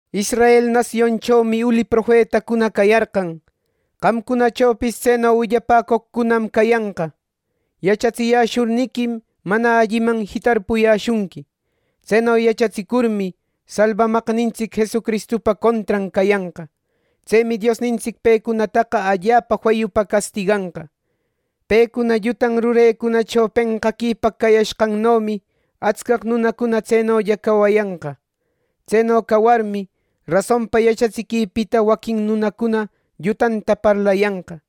Israel nasionchomi uli profetacuna cayarqan. Qamcunachopis tseno willapäcoqcunam cayanqa. Yachatsiyäshurniquim, mana alliman jitarpuyäshunqui. Tseno yachatsicurmi, Salbamaqnintsic Jesucristupa contran cayanqa. Tsemi Diosnintsic pecunataqa allapa feyupa castiganqa. Pecuna llutan rurecunacho penqaquipaq cawayashqannomi atscaq nunacuna tsenolla cawayanqa. Tseno cawarmi, rasonpa yachatsiquipita waquin nunacuna llutanta parlayanqa.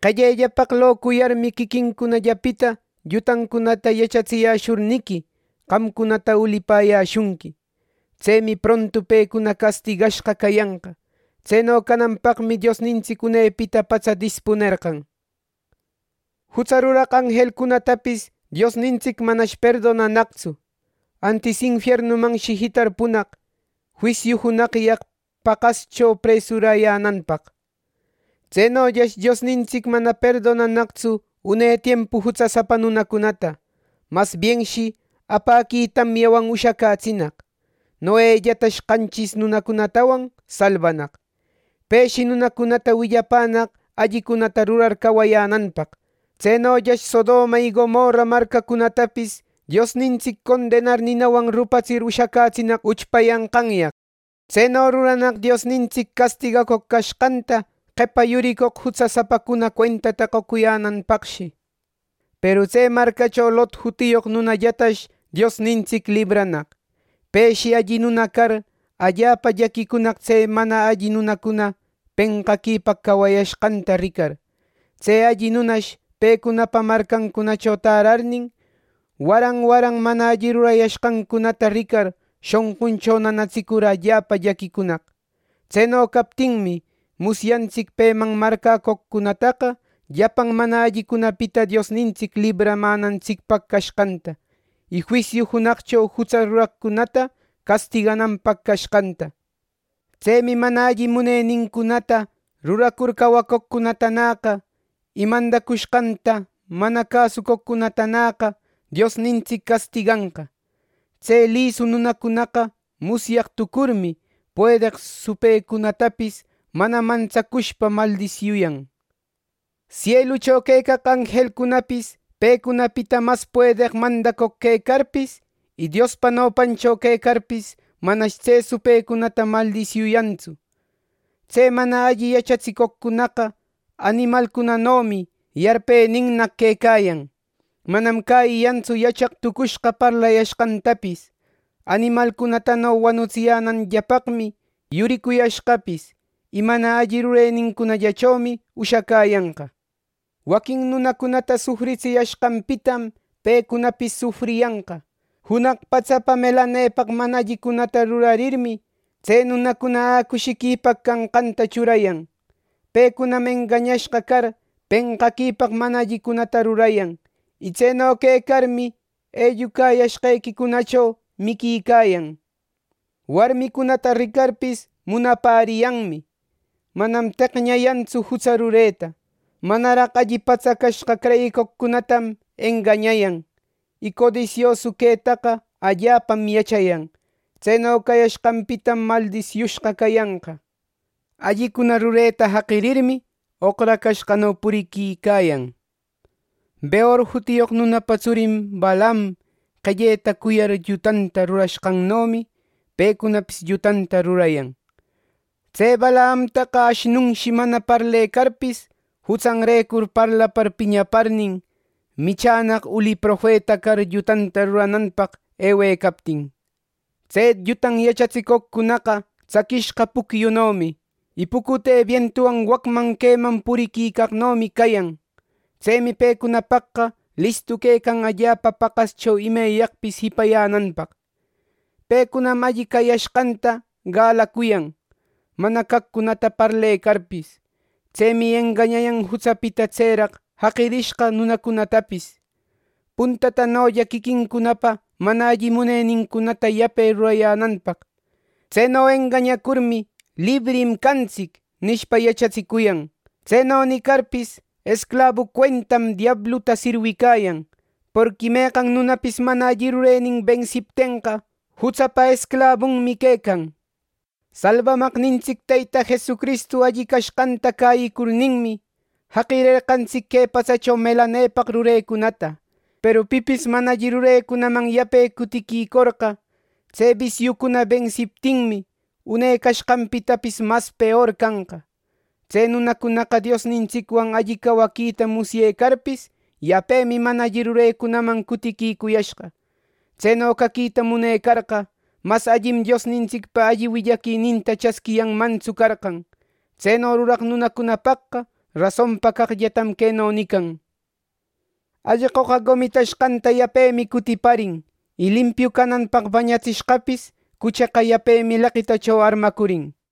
Qellellapaq locuyarmi, quiquincunallapita llutancunata yachatsiyäshurniqui, qamcunata ulipäyäshunqui. Tsemi prontu pecuna castigashqa cayanqa. Tseno cananpaqmi Diosnintsic unepita patsa dispunerqan. Jutsa ruraq anjelcunatapis Diosnintsic manash perdonanaqtsu; antis infiernumanshi jitarpunaq, juisiu junaqyaq paqascho presuräyänanpaq. Tsenollash Diosnintsic mana perdonanaqtsu une tiempu jutsasapa nunacunata. Masbienshi apäqui tamyawan ushacätsinaq. Noellatash qanchis nunacunatawan salbanaq. Peshi nunacunata willapänaq allicunata rurar cawayänanpaq. Tsenollash Sodoma y Gomorra marcacunatapis Diosnintsic condenar ninawan rupatsir ushacätsinaq uchpayanqanyaq. Tseno ruranaq Diosnintsic castigacoq cashqanta qepa yuricoq jutsasapacuna cuentata qocuyänanpaqshi. Peru tse marcacho Lot jutiyoq nunallatash Diosnintsic libranaq. Peshi alli nuna car, allapa llaquicunaq tse mana alli nunacuna penqaquipaq cawayashqanta ricar. Tse alli nunash pecunapa marcancunacho tärarnin, waran waran mana alli rurayashqancunata ricar, shonquncho nanatsicur allapa llaquicunaq. Tseno captinmi, musyantsic peman marcäcoqcunataqa llapan mana allicunapita Diosnintsic libramänantsicpaq cashqanta, y juisiu junaqcho jutsa ruraqcunata castigananpaq cashqanta. Tsemi mana alli munenincunata ruracur cawacoqcunatanäqa, y mandacushqanta mana cäsucoqcunatanäqa Diosnintsic castiganqa. Tse lisu nunacunaqa musyaq tucurmi, puedeq supëcunatapis mana mantsacushpa maldisiuyan. Sielucho quecaq anjelcunapis pecunapita mas puedeq mandacoq quecarpis, y Diospa nopancho quecarpis manash tse supëcunata maldisiuyantsu. Tse mana alli yachatsicoqcunaqa animalcunanomi: Yarpeninnaq quecayan; manam cäyiyantsu yachaq tucushqa parlayashqantapis; animalcunatano wanutsiyänanllapaqmi yuricuyashqapis. Y mana alli rurenincunallachomi ushacäyanqa. Waquin nunacunata sufritsiyashqanpitam pecunapis sufriyanqa. Junaq patsapa melanepaq mana allicunata rurarirmi, tse nunacuna ä cushiquipaq canqanta churayan. Pecunam engañashqa car, penqaquipaq mana allicunata rurayan. Y tseno quecarmi, ellucayashqequicunacho miquicayan. Warmicunata ricarpis munapäriyanmi. Manam teqñayantsu jutsa rureta. Manaraq alli patsacashqa creyicoqcunatam engañayan. Y codisiosu quetaqa allapam yachayan. Tseno cayashqanpitam maldisiushqa cayanqa. Allicuna rureta jaqirirmi, oqracashqano puriquicayan. Beor jutiyoq nunapa tsurin Balaam qelleta cuyar llutanta rurashqannomi, pecunapis llutanta rurayan. Tse Balaamtaqa ashnunshi mana parlecarpis, jutsanrecur parlapar piñaparnin, michänaq uli profeta car llutanta rurananpaq ewecaptin. Tse llutan yachatsicoqcunaqa tsaquishqa pucyunomi. Y pucute bientuwan wacman queman puriquicaqnomi cayan. ¡Tsemi pecunapaqqa listu quecan allapa paqascho imeyaqpis jipayänanpaq! Pecunam alli cayashqanta galacuyan, mana caqcunata parlecarpis. Tsemi engañayan jutsapita tseraq raquicashqa nunacunatapis, puntatanolla quiquincunapa mana alli munenincunata yape ruracuyänanpaq. Tseno engañacurmi, “Librim cantsic” nishpa, yachatsicuyan. Tseno nicarpis, esclabu cuentam diabluta sirwicayan. Porqui meqan nunapis mana alli rurenin bensiptenqa, jutsapa esclabunmi quecan. Salbamaqnintsic Teyta Jesucristu alli cashqanta cäyicurninmi, jaqirerqantsic que patsacho melanepaq rurecunata. Peru pipis mana alli rurecunaman yape cutiquicorqa, tse bisiucuna bensiptinmi, une cashqanpitapis mas peor canqa. Tse nunacunaqa Diosnintsicwan alli cawaquita musyecarpis, yapemi mana alli rurecunaman cutiquicuyashqa. Tseno caquita munecarqa, mas allim Diosnintsicpa alli willaquininta chasquiyanmantsu carqan. Tseno ruraq nunacunapaqqa rasonpa caqllatam queno nican: “Allqoqa gomitashqanta yapemi cutipärin; y limpiu cananpaq bañatsishqapis cucheqa yapemi leqitacho armacurin.”